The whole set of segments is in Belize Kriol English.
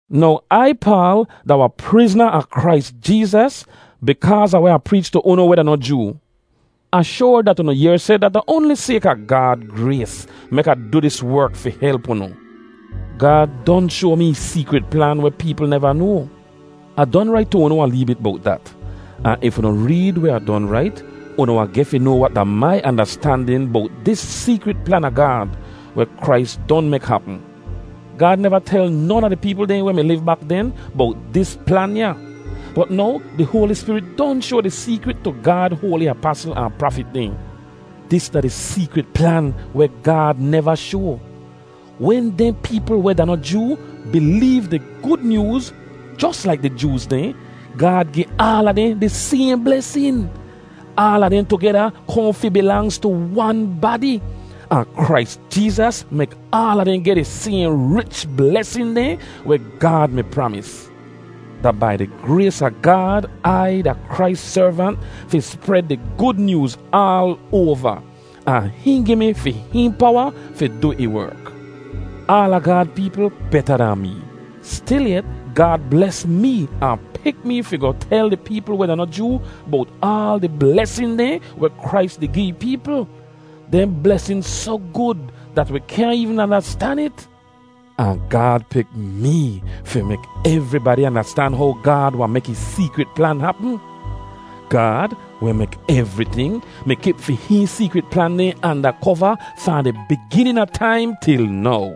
Now Ai, Paal, da wahn prizna a Krais Jeezas bikaaz a weh Ah preech tu unu weh da noh Joo. Ah shoar dat unu yehr seh dat da oanli sayka Gaad grays mek Ah du dis werk fi help unu. Gaad don shoa mi ih seekrit plan weh peepl neva noa. (Ah don rait tu unu wahn lee bit bowt dat. Ahn if unu reed weh Ah don rait, unu wahn geh fi noa wat da mai andastandin bowt dis seekrit plan a Gaad, weh Krais don mek hapm.) Gaad neva tel non a di peepl dehn weh mi liv bak den bowt dis plan ya. Bot now di Hoali Spirit don shoa di seekrit tu Gaad hoali apasl ahn prafit dehn. Dis da di seekrit plan weh Gaad neva shoa: Wen dehn peepl weh da noh Joo bileev di Gud Nyooz jos laik di Jooz dehn, Gaad gi aala dehn di sayhn blesin. Aala dehn tugeda kohn fi bilangz tu wan badi. Ahn Krais Jeezas mek aala dehn geh di sayhn rich blesin dehn weh Gaad mi pramis. Da bai di grays a Gaad Ai da Krais servant fi spred di Gud Nyooz aal oava, ahn hihn gi mi fi hihn powa fi du ih werk. Aala Gaad peepl beta dahn mee. Stilyet, Gaad bles mee ahn pik mee fi goh tel di peepl weh da noh Joo bowt aal di blesin dehn weh Krais di gi ih peepl. Dehn blesin soh gud dat wi kyaahn eevn andastan it. Ahn Gaad pik mee fi mek evribadi andastan how Gaad wahn mek ih seekrit plan hapm. Gaad, weh mek evriting, mi kip fi hihn seekrit plan dehn anda kova fahn di biginin a taim til now.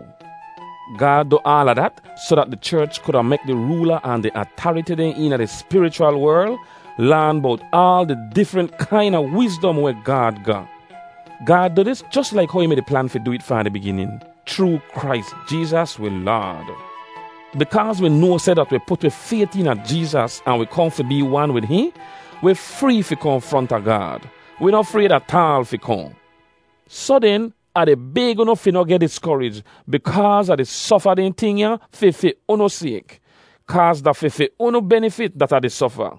Gaad du aala dat soh dat di cherch kuda mek di roola ahn di atariti dehn eena di spirichwal werl laan bowt aal di difrent kaina wizdom weh Gaad ga. Gaad du dis jos laik how ih mi-di plan fi du it fahn di biginin, chroo Krais Jeezas wi Laad. Bikaaz wi noa seh dat wi put wi fayt eena Jeezas ahn wi kohn fi bee wan wid hihn, wi free fi kohn fronta Gaad. Wi noh frayd ataal fi kohn. Soh den, Ah di bayg unu fi noh geh diskorij bikaaz Ah di sofa dehn ting ya fi fi unu sayk. Kaaz da fi fi unu benifit dat Ah di sofa.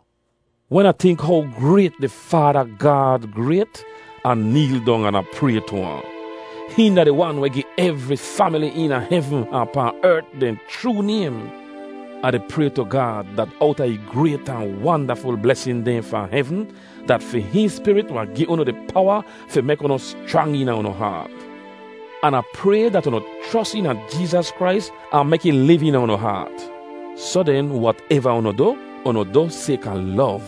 Wen Ah tink how grayt di Faada Gaad grayt, Ah neel dong an Ah pray tu ahn. Hihn da di Wan weh gi evri famili eena hevn ahn pahn ert dehn chroo naym. Ah di pray tu Gaad, dat owta ih grayt ahn wandaful blesin dehn fahn hevn, dat fi hihn Spirit wahn gi unu di powa fi mek unu schrang eena unu haat. An Ah pray dat unu chros eena Jeezas Krais ahn mek ih liv eena unu haat. Soh den, wateva unu du, unu du sayka lov.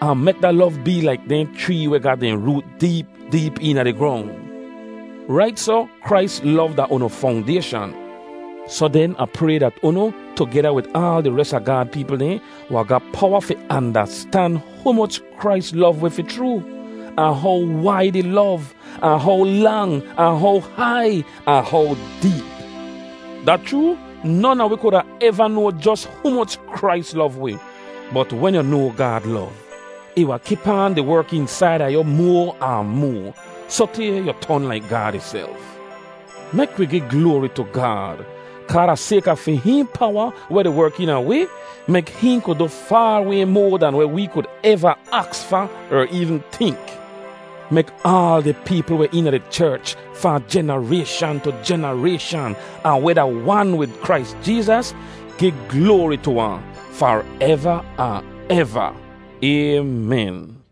Ahn mek da lov bee laik dehn chree weh ga dehn root deep deep eena di grong. Rait soh, Krais lov da unu fongdayshan. Soh den, Ah pray dat unu, tugeda wid aal di res a Gaad peepl dehn, wahn ga powa fi andastan humoch Krais lov wi fi chroo, ahn how waid ih lov, ahn how lang, ahn how hai, ahn how deep. Da chroo! Non a wi kuda eva noa jos humoch Krais lov wi. Bot wen yu noa Gaad lov, ih wahn kip aan di werk eensaida yu moa ahn moa, sotay yu ton laik Gaad ihself. Mek wi gi gloari tu Gaad! Kaa da sayka fi hihn powa weh di werk eena a wi, mek hihn kud du faar way moa dahn weh wee kud eva aks fa er eevn tink. Mek aal di peepl weh eena di cherch fahn jenarayshan tu jenarayshan ahn weh da wan wid Krais Jeezas, gi gloari tu ahn, fareva ahn eva! Aymen.